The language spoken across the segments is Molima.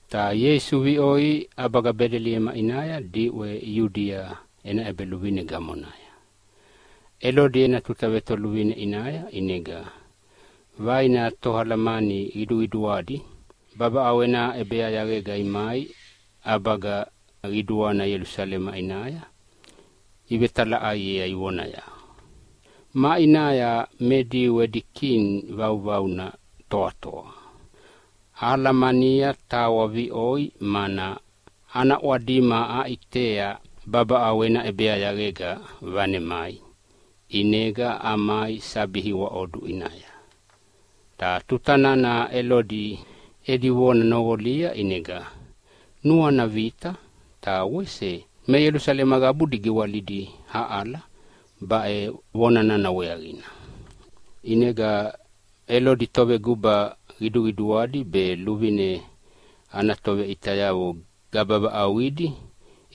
Ta Ieisu viʼoi ʼabaga Bedeliema ʼinaya diʼwe Iudia ena ʼebeluvine gamonaya, Elodi ena tuta vetoluvine ʼinaya. ʼInega vaina toalamani qiduqiduadi babaʼau ena ʼebeyayaqega imai ʼabaga qiduana Ielusalema ʼinaya ivetalaʼaiea ivonaya, “Maʼinaya me Diu edi Kini vauvauna toatoa? Ahalamania tawa viʼoi mana ana ʼwadima aʼitea babaʼau ena ʼebeyayaqega vanemai. ʼInega amai sabi iwaʼodu ʼinaya.” Ta tuta nana Elodi edi vona noqolia ʼinega nuana vita, ta wese me Ielusalema qabudi giwalidi aʼala baʼe vona nana weaqina. ʼInega Elodi toveguba qiduqiduadi be luvine ana toveʼitayavo gaba vaʼauqidi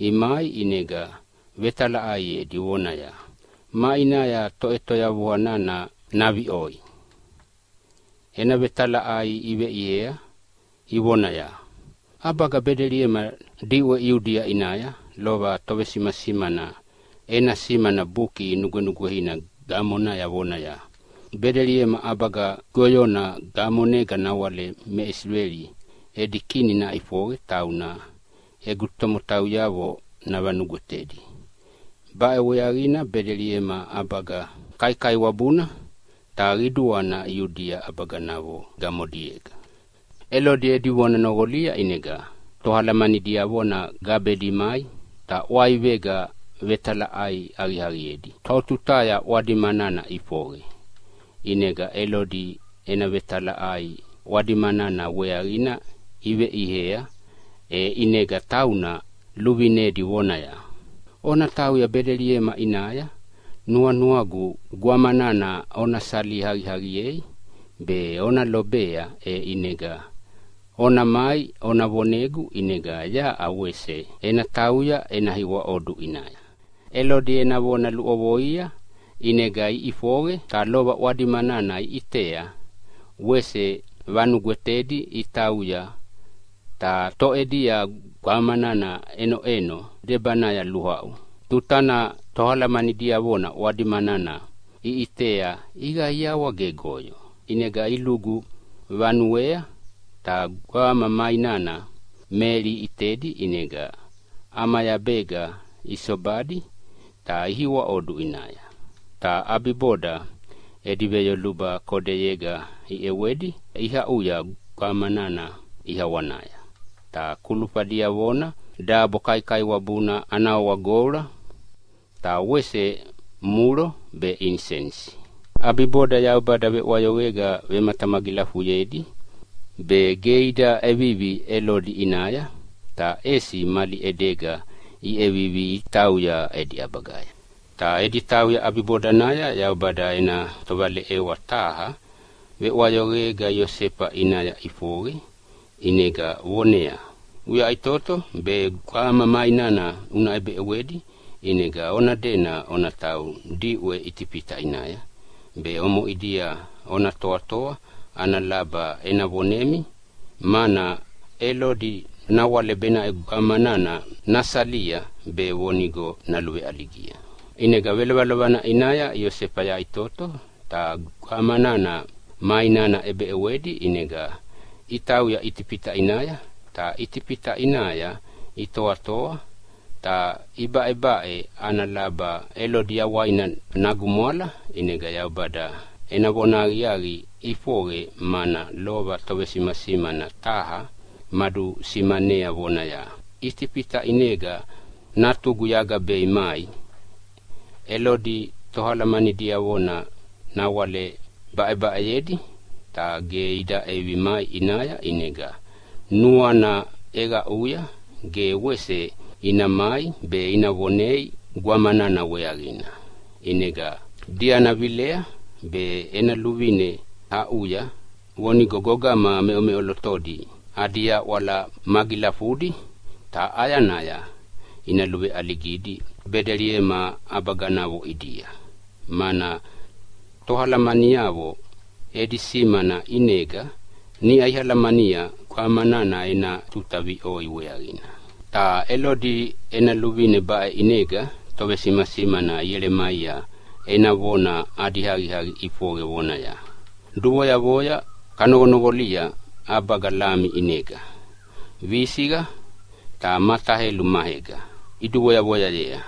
imai, ʼinega vetalaʼaiedi vonaya, “Maʼinaya Toʼetoyavua nana naviʼoi?” Ena vetalaʼai iveʼiea ivonaya, “ʼAbaga Bedeliema diʼwe Iudia ʼinaya. Lova tovesimasimana ena simana Buki Nugwenugweina gamonaya vonaya, ‘Bedeliema ʼabaga goyona gamonega nawale me Isileli edi Kini naʼifoqe, tauna egu tomotauyavo navanugwetedi. Baʼe weaqina Bedeliema ʼabaga kaikaiwabuna ta qiduana Iudia ʼabaganavo gamodiega.’” Elodi edi vona noqolia ʼinega toalamani diavona gabedi imai ta ʼwaivega vetalaʼai aqiaqiedi totutaya ʼwadima nana ʼifoqe. ʼInega Elodi ena vetalaʼai ʼwadima nana weaqina iveʼiea, e ʼinega tauna luvinedi vonaya, “Ona tauya Bedeliema ʼinaya nuanuagu gwama nana ona sali aqiaqiei be ona lobea, e ʼinega ona mai ona vonegu, ʼinega yaʼa wese ena tauya ena iwaʼodu ʼinaya.” Elodi ena vona luʼovoia ʼinega iʼifoqe, ta lova ʼwadima nana iʼitea wese vanugwetedi itauya, ta toʼedia gwama nana ʼenoʼeno debanaya luaʼu. Tuta nana toalamani diavona ʼwadima nana iʼitea iqaiawa gegoyo. ʼInega ilugu vanuea ta gwama ma inana Meli iʼitedi, ʼinega ʼamayabega isobadi ta ihiwaʼodu ʼinaya. Ta ʼabiboda edi veyoluba kodeyega iʼewedi iaʼuya gwama nana ʼiawanaya. Ta kulufa diavona dabo kaikaiwabuna ana wawa goula, ta wese mulo be inisenisi. ʼAbiboda Yaubada veʼwayoqega vematamagilafuyedi be ge ida ʼevivi Elodi ʼinaya, ta ʼesi mali ʼedega iʼevivi itauya edi ʼabagaya. Ta edi tauya ʼabibodanaya Yaubada ena tovaleʼewa taha veʼwayoqega Iosefa ʼinaya ʼifoqe ʼinega voneaya, “Uyaʼitoto, be gwama ma inana una ʼebeʼewedi ʼinega ona dena ona tauya diʼwe Itifita ʼinaya. Be omoʼidia ona toatoa ana laba ena vonemi, mana Elodi nawale benaʼe gwamana nasalia be vonigo naluveʼaligia.” ʼInega velovelovana ʼinaya Iosefa yaʼitoto ta gwama nana ma inana ʼebeʼewedi ʼinega itauya Itifita ʼinaya. Ta Itifita ʼinaya itoatoa ta ibaʼebaʼe ana laba Elodi yawaina nagumwala, ʼinega Yaubada ena vona ana aqiaqi ʼifoqe, mana lova tovesimasimana taha madusimanea vonaya, “Itifita ʼinega Natugu yagabei mai.” Elodi toalamani diavona nawale baʼebaʼeyedi, ta ge ida ʼevivi mai ʼinaya. ʼInega nuana ʼeqaʼuya ge wese ina mai be ina vonei gwama nana weaqina. ʼInega diana vilei be ena luvine aʼuya vonigo gogama meʼomeʼolotodi adi yaʼwala magilafudi ta ʼayanaya ina luveʼaligidi Bedeliema ʼabaganavo ʼidia, mana toalamaniavo edi simana ʼinega niʼa alamania gwama nana ena tuta viʼoi weaqina. Ta Elodi ena luvine baʼe ʼinega tovesimasimana Ielemaia ena vona adi aqiaqi ʼifoqe vonaya, “Duvoyavoya kanoqonoqolia ʼabaga Lama ʼinega, visiqa ta mataelu maega iduduvoyavoya,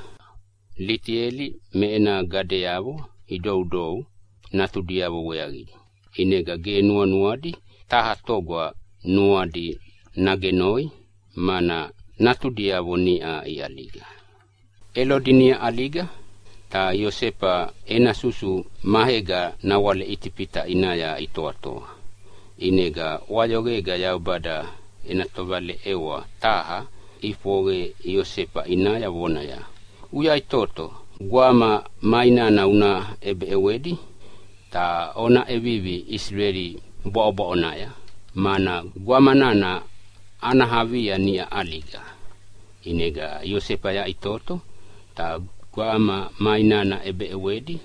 Litieli me ena gadeavo idoudou natudiavo weaqidi, ʼinega ge nuanuadi taha toga nuadi nagenoi mana natudiavo niʼa iʼaliga.” Elodi niʼa ʼaliga, ta Iosefa ena susu maega nawale Itifita ʼinaya itoatoa. ʼInega ʼwayoqega Yaubada ena tovaleʼewa taha ʼifoqe Iosefa ʼinaya vonaya, “Uyaʼitoto, gwama ma inana una ʼebeʼewedi ta ona ʼevivi Isileli bwaʼobwaʼonaya, mana gwama nana ana avia niʼa ʼaliga.” ʼInega Iosefa yaʼitoto ta gwama ma inana ʼebeʼewedi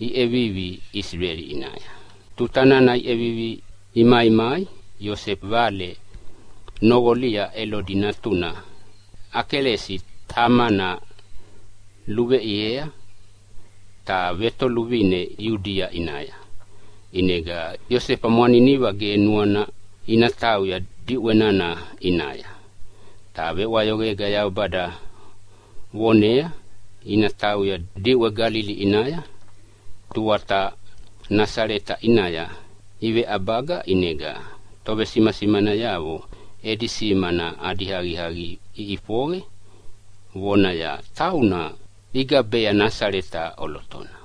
iʼevivi Isileli ʼinaya. Tuta nana iʼevivi imaimai Iosefa vale noqolia Elodi natuna Akeleasi tamana luveʼiea ta vetoluvine Iudia ʼinaya. ʼInega Iosefa mwaniniva ge nuana ina tauya diʼwe nana ʼinaya. Ta veʼwayoqega Yaubada vonea ina tauya diʼwe Galili ʼinaya. Tuata Nasaleta ʼinaya iveʼabaga. ʼInega tovesimasimanayavo edi simana adi aqiaqi ʼifoqe vonaya, “Tauna ina gabea Nasaleta ʼolotona.”